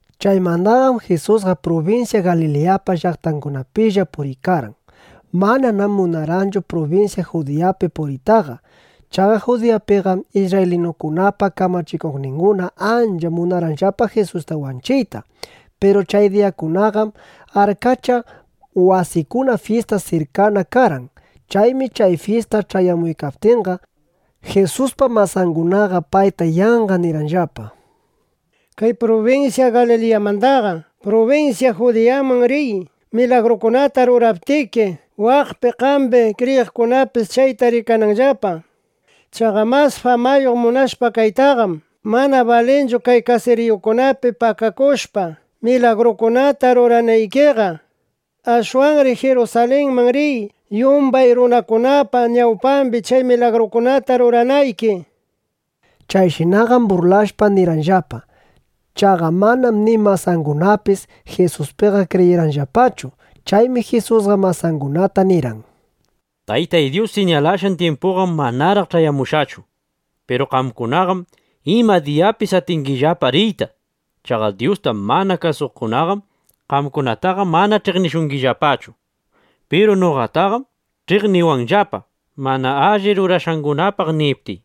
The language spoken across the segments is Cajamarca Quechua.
Chaymandaqam Jisusqa prubinsya Galiliyapa llaqtangunapilla puriykarqan. Mananam munarqanchu prubinsya Judiyapi puriytaqa. Chaqa Judiyapiqam isrraylinukunapa kamachikuqninguna ancha munarqanllapa Jisusta wanchiyta. Piru chay diyakunaqam arkacha wasikuna fyista sirkana karqan. Chaymi chay fyista ch'ayamuykaptinqa, Jisuspa masangunaqa payta yanqa nirqanllapa: —Kay prubinsya Galiliyamandaqa prubinsya Judiyaman riy, milagrukunata ruraptiki, waqpi qambi kriyiqkunapis chayta rikananllapa. Chaqa mas famayuq munashpa kaytaqam, mana balinchu kay kasiriyukunapi pakakushpa, milagrukunata ruranaykiqa. Ashwanri Jirusalinman riy, yumbay runakunapa ñawpambi chay milagrukunata ruranayki, nishpa. Chayshinaqam burlashpa nirqanllapa. Chaqa manam ni masangunapis Jisuspiqa kriyirqanllapachu. Chaymi Jisusqa masangunata nirqan: —Tayta Dyus siñalashqan tyimpuyqam manaraq ch'ayamushqachu. Piru qamkunaqam ima diyapis atingillapa riyta. Chaqa Dyusta mana kasuqkunaqam qamkunataqa mana ch'iqnishungillapachu. Piru noqataqam ch'iqniwanllapa, mana alli rurashqangunapaq niptiy.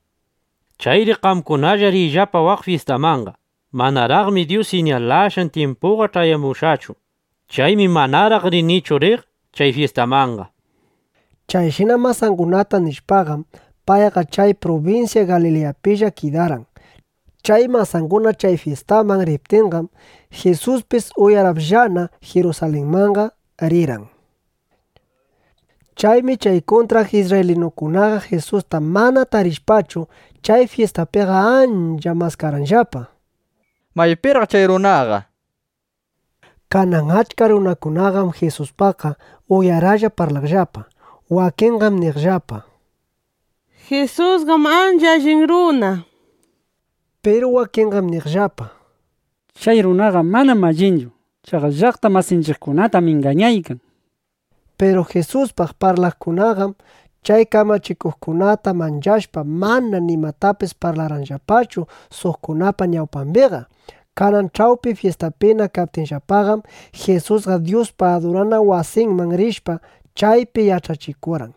Chayri qamkunalla riyllapa waq fyistamanqa. Manaraqmi Dyus siñalashqan tyimpuyqa ch'ayamushqachu. Chaymi manaraq rinichu riq chay fyistamanqa. Chayshina masangunata nishpaqam, payqa chay prubinsya Galiliyapilla kidarqan. Chay masanguna chay fyistaman riptinqam, Jisuspis uyarapllana (uyarallana) Jirusalinmanqa rirqan. Chaymi chay kuntraq isrraylinukunaqa Jisusta mana tarishpachu, chay fyistapiqa ancha maskarqanllapa: —¿Maypiraq chay runaqa? nishpa. Kanan achka runakunaqam Jisuspaqqa uyaraplla (uyaralla) parlaqllapa. Wakinqam niqllapa: —Jisusqam ancha allin runa, nishpa. Piru wakinqam niqllapa: —Chay runaqam mana allinchu. Chaqa llaqta masinchiqkunatam ingañaykan, nishpa. Piru Jisuspaq parlaqkunaqam, chay kamachikuqkunata manchashpa, mana nimatapis parlarqanllapachu suqkunapa ñawpambiqa. Kanan ch'awpi fyistapina kaptinllapaqam, Jisusqa Dyuspa adurana wasinman rishpa, chaypi yach'achikurqan.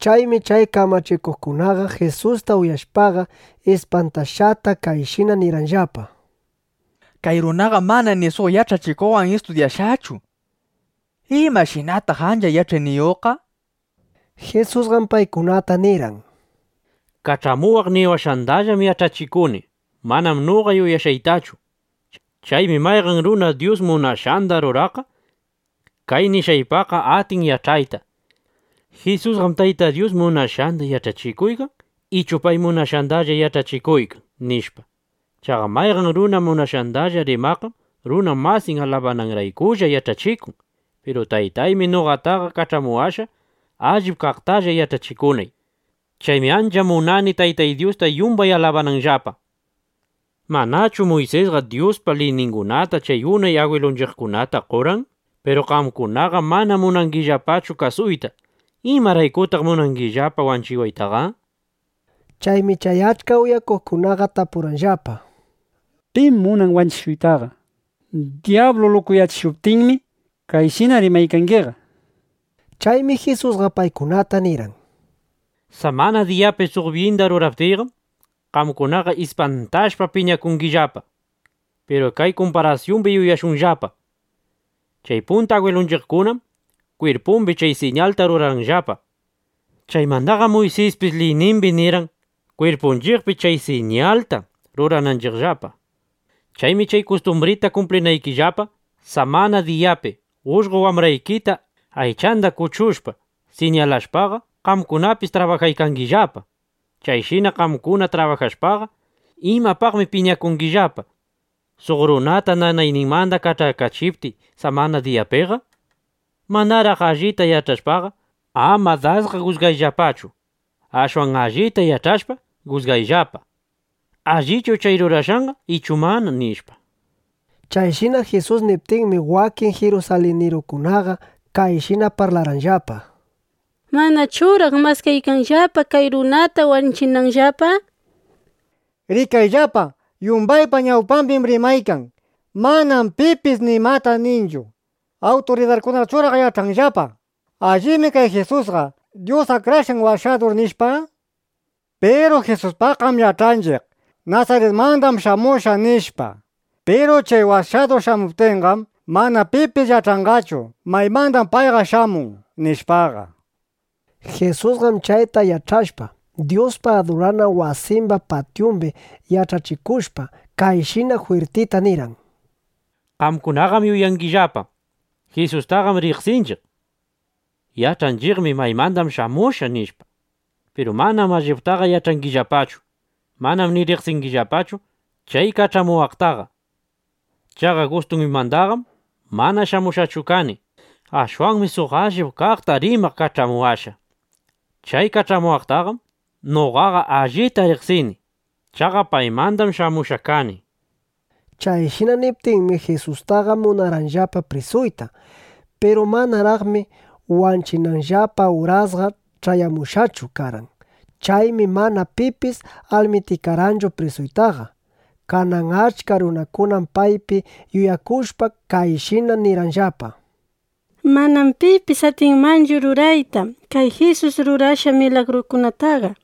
Chaymi chay kamachikuqkunaqa Jisusta uyashpaqa, ispantashqata kayshina nirqanllapa: —Kay runaqam mana ni suq yach'achikuqwan istudyashqachu. ¿Imashinataq ancha yach'ayniyuqqa? nishpa. Jisusqam paykunata nirqan: —Kach'amuwaq niwashqandallam yach'achikuni; manam noqa yuyashqaytachu. Chaymi mayqan runa Dyus munashqanda ruraqqa kay nishqaypaqqa atin yach'ayta: ¿Jisusqam Tayta Dyus munashqanda yach'achikuykan ichu pay munashqandalla yach'achikuykan? nishpa. Chaqa mayqan runa munashqandalla rimaqqam runa masin alabananraykulla yach'achikun. Piru Taytaymi noqataqa kach'amuwashqa, allip kaqtalla yach'achikunay. Chaymi ancha munani Taytay Dyusta yumban alabananllapa. ’¿Manachu Muysisqa Dyuspa liyningunata chay unay agwilunchiqkunata qorqan? Piru qamkunaqam mana munangillapachu kasuyta. ¿Imaraykutaq munangillapa wanchiwaytaqa? nishpa. Chaymi chay achka uyaqkunaqa tapurqanllapa: —¿Pim munan wanchishuytaqa? Dyablum lukuyachishushqa, chayshina rimanaykiqa, nishpa. Chaymi Jisusqa paykunata nirqan: —Samana diyapi suq byinda ruraptiyqam, qamkunaqa ispantashpa, piñakungillapa. Piru kay kumparasyumbi yuyashunllapa: Chay punta agwilunchiqkunam kwirpumbi chay siñalta rurarqanllapa. Chaymandaqam Muysispis liynimbi nirqan, kwirpunchiqpi chay siñalta rurananchiqllapa. Chaymi chay kustumbrita kumplinaykillapa, samana diyapi ullqo wambraykita aychanda kuchushpa, siñalashpaqa, qamkunapis trabajaykangillapa. Chayshina qamkuna trabajashpaqa, ¿imapaqmi piñakungillapa, suq runata nanayninmanda kach'akachiptiy samana diyapiqa? Manaraq allita yach'ashpaqa, ama dasqa jusgayllapachu. Ashwan allita yach'ashpa, jusgayllapa: ¿Allichu chay rurashqanqa ichu mana? nishpa. Chayshina Jisus niptinmi, wakin jirusalinirukunaqa kayshina parlarqanllapa: —¿Manachuraq maskaykanllapa kay runata wanchinanllapa? Rikayllapa, yumbaypa ñawpambim rimaykan. Manam pipis nimata ninchu. ¿Awturidarkunachuraq yach'anllapa: Allibmi kay Jisusqa Dyus Akrashqan Washadur, nishpa? Piru Jisuspaqqam yach'anchiq: Nasaritmandam shamushqa, nishpa. Piru chay Washadur shamuptinqam, mana pipis yach'anqachu: Maymandam payqa shamun, nishpaqa. Jisusqam chayta yach'ashpa, Dyuspa adurana wasimba patyumbi yach'achikuykashpa, kayshina jwirtita nirqan: —Qamkunaqam yuyangillapa: Jisustaqam riqsinchiq. Yach'anchiqmi maymanda shamushqa, nishpa. Piru manam alliptaqa yach'angillapachu. Manam ni riqsingillapachu chay kach'amuwaqtaqa. Chaqa gustuymandaqam mana shamushqachu kani. Ashwanmi suq allip kaqta rimaq kach'amuwashqa. Chay kach'amuwaqtaqam noqaqa allita riqsini. Chaqa paymandam shamushqa kani, nishpa. Chayshina niptinmi, Jisustaqa munarqanllapa prisuyta. Piru manaraqmi wanchinanllapa urasqa ch'ayamushqachu karqan. Chaymi mana pipis almitikarqanchu prisuytaqa. Kanan achka runakunam paypi yuyakushpa, kayshina nirqanllapa: —Manam pipis atinmanchu rurayta kay Jisus rurashqan milagrukunataqa.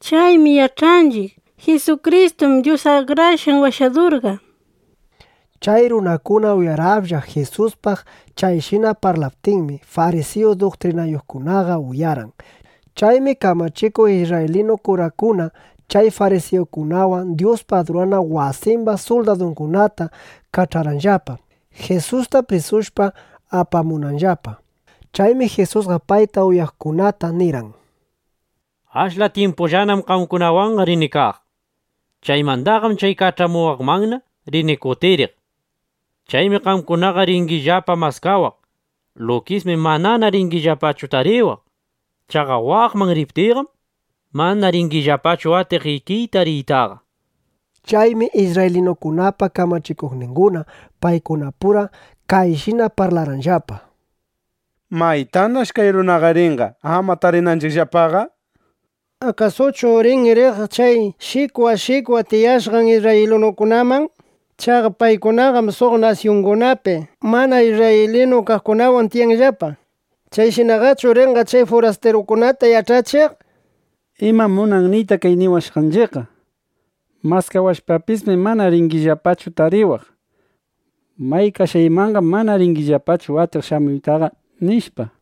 Chaymi yach'anchiq: Jisukristum Dyus Akrashqan Washadurqa, nishpa. Chay runakuna uyaraplla (uyaralla) Jisuspaq chayshina parlaptinmi, farisiyu duktrinayuqkunaqa uyarqan. Chaymi kamachikuq isrraylinu kurakuna chay farisiyukunawan Dyuspa adurana wasimba suldadungunata kach'arqanllapa, Jisusta prisushpa apamunanllapa. Chaymi Jisusqa payta uyaqkunata nirqan: —Ashla tyimpullanam qamkunawanqa rini kaq. Chaymandaqam chay kach'amuwaqmanna rini kutiriq. Chaymi qamkunaqa ringillapa maskawaq. Lukismi manana ringillapachu tariwaq. Chaqa waqman riptiyqam, mana ringillapachu atiq ikiyta riytaqa, nishpa. Chaymi isrraylinukunapa kamachikuqninguna paykunapura kayshina parlarqanllapa: —¿Maytanash kay runaqa rinqa, ama tarinanchiqllapaqa? ¿Akasuchu rin riq chay shikwa shikwa tiyashqan isrraylinukunaman? Chaqa paykunaqam suq nasyungunapi mana isrraylinu kaqkunawan tiyanllapa. ¿Chayshinaqachu rinqa, chay furastirukunata yach'achiq? ¿Imam munan niyta kay niwashqanchiqqa: “Maskawashpapismi, mana ringillapachu tariwaq. May kashqaymanqam mana ringillapachu atiq shamuytaqa”, nishpa?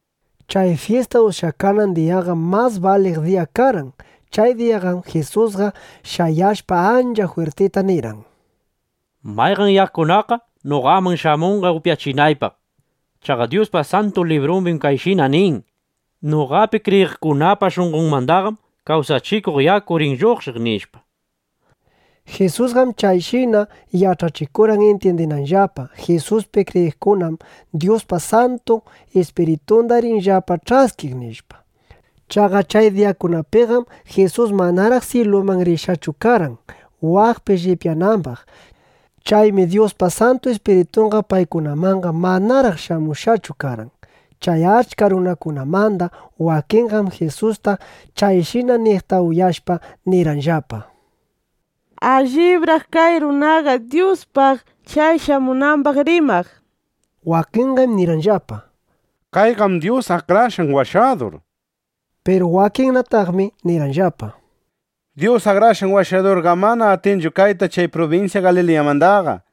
Chay fyista ushyakanan diyaqam mas baliq diya karqan. Chay diyaqam Jisusqa shayashpa, ancha jwirtita nirqan: —Mayqan yakunaqqa noqaman shamunqa upyachinaypaq. Chaqa Dyuspa Santu Librumbim kayshina nin: “Noqapi kriyiqkunapa shunqonmandaqam kawsachikuq yaku rin lluqshiq”, nishpa. Jisusqam chayshina yach'achikurqan, intyindinanllapa: Jisuspi kriyiqkunam Dyuspa Santu Ispiritunda rinllapa ch'askiq, nishpa. Chaqa chay diyakunapiqam Jisus manaraq syiluman rishqachu karqan, waqpi llipyanambaq. Chaymi Dyuspa Santu Ispiritunqa paykunamanqa manaraq shamushqachu karqan. Chay achka runakunamanda wakinqam Jisusta chayshina niqta uyashpa, nirqanllapa: —Allibraq kay runaqa Dyuspaq chay shamunambaq rimaq, nishpa. Wakinqam nirqanllapa: —Kayqam Dyus Akrashqan Washadur, nishpa. Piru wakinnataqmi nirqanllapa: —Dyus Akrashqan Washadurqam mana atinchu kayta chay prubinsya Galiliyamandaqa.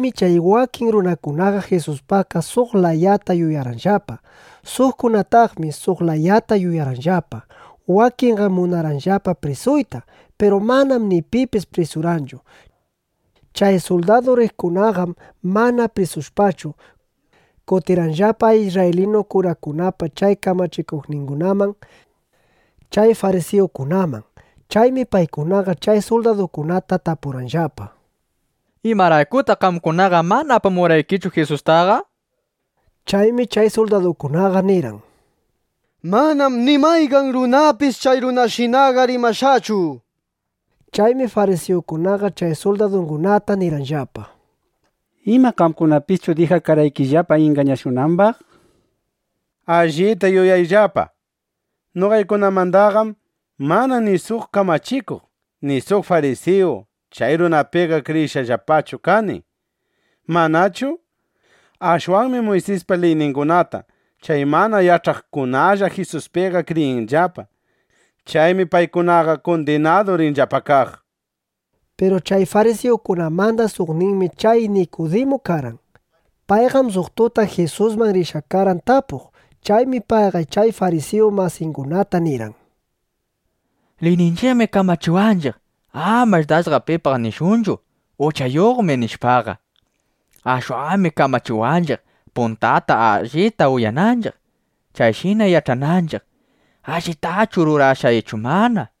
Chaymi chay wakin runakunaqa Jisuspaqqa suq layata yuyarqanllapa. Suqkunanataqmi suq layata yuyarqanllapa. Wakinqam munarqanllapa prisuyta. Piru manam ni pipis prisurqanchu. Chay suldadu riqkunaqam mana prisushpachu, kutirqanllapa isrraylinu kurakunapa chay kamachikuqningunaman, chay farisiyukunaman. Chaymi paykunaqa chay suldadukunata tapurqanllapa: —¿Imaraykutaq qamkunaqa mana apamurqaykichu Jisustaqa? nishpa. Chaymi chay suldadukunaqa nirqan: —¡Manam ni mayqan runapis chay runashinaqa rimashqachu! nishpa. Chaymi farisiyukunaqa chay suldadungunata nirqanllapa: —¿Ima, qamkunapischu dijakarqaykillapa ingañashunambaq? Allita yuyayllapa, noqaykunamandaqam mana ni suq kamachikuq, ni suq farisiyu chay runapiqa kriyishqallapachu kani, ¿manachu? Ashwanmi Muysispa liyningunata chay mana yach'aqkunalla Jisuspiqa kriyinllapa. Chaymi paykunaqa kundinadu rinllapa kaq, nishpa. Piru chay farisiyukunamanda suqninmi chay Nikudimu karqan. Payqam suq tuta Jisusman rishqa karqan tapuq. Chaymi payqa chay farisiyu masingunata nirqan: —Liyninchiqmi kamachiwanchiq, amash dasqa pipaq nishunchu: “Uchayuqmi”, nishpaqa. Ashwanmi kamachiwanchiq, puntata allita uyananchiq, chayshina yach'ananchiq: ¿Allitachu rurashqa ichu mana? nishpa.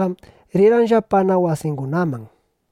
Chayshina nishpaqam, rirqanllapana wasingunaman.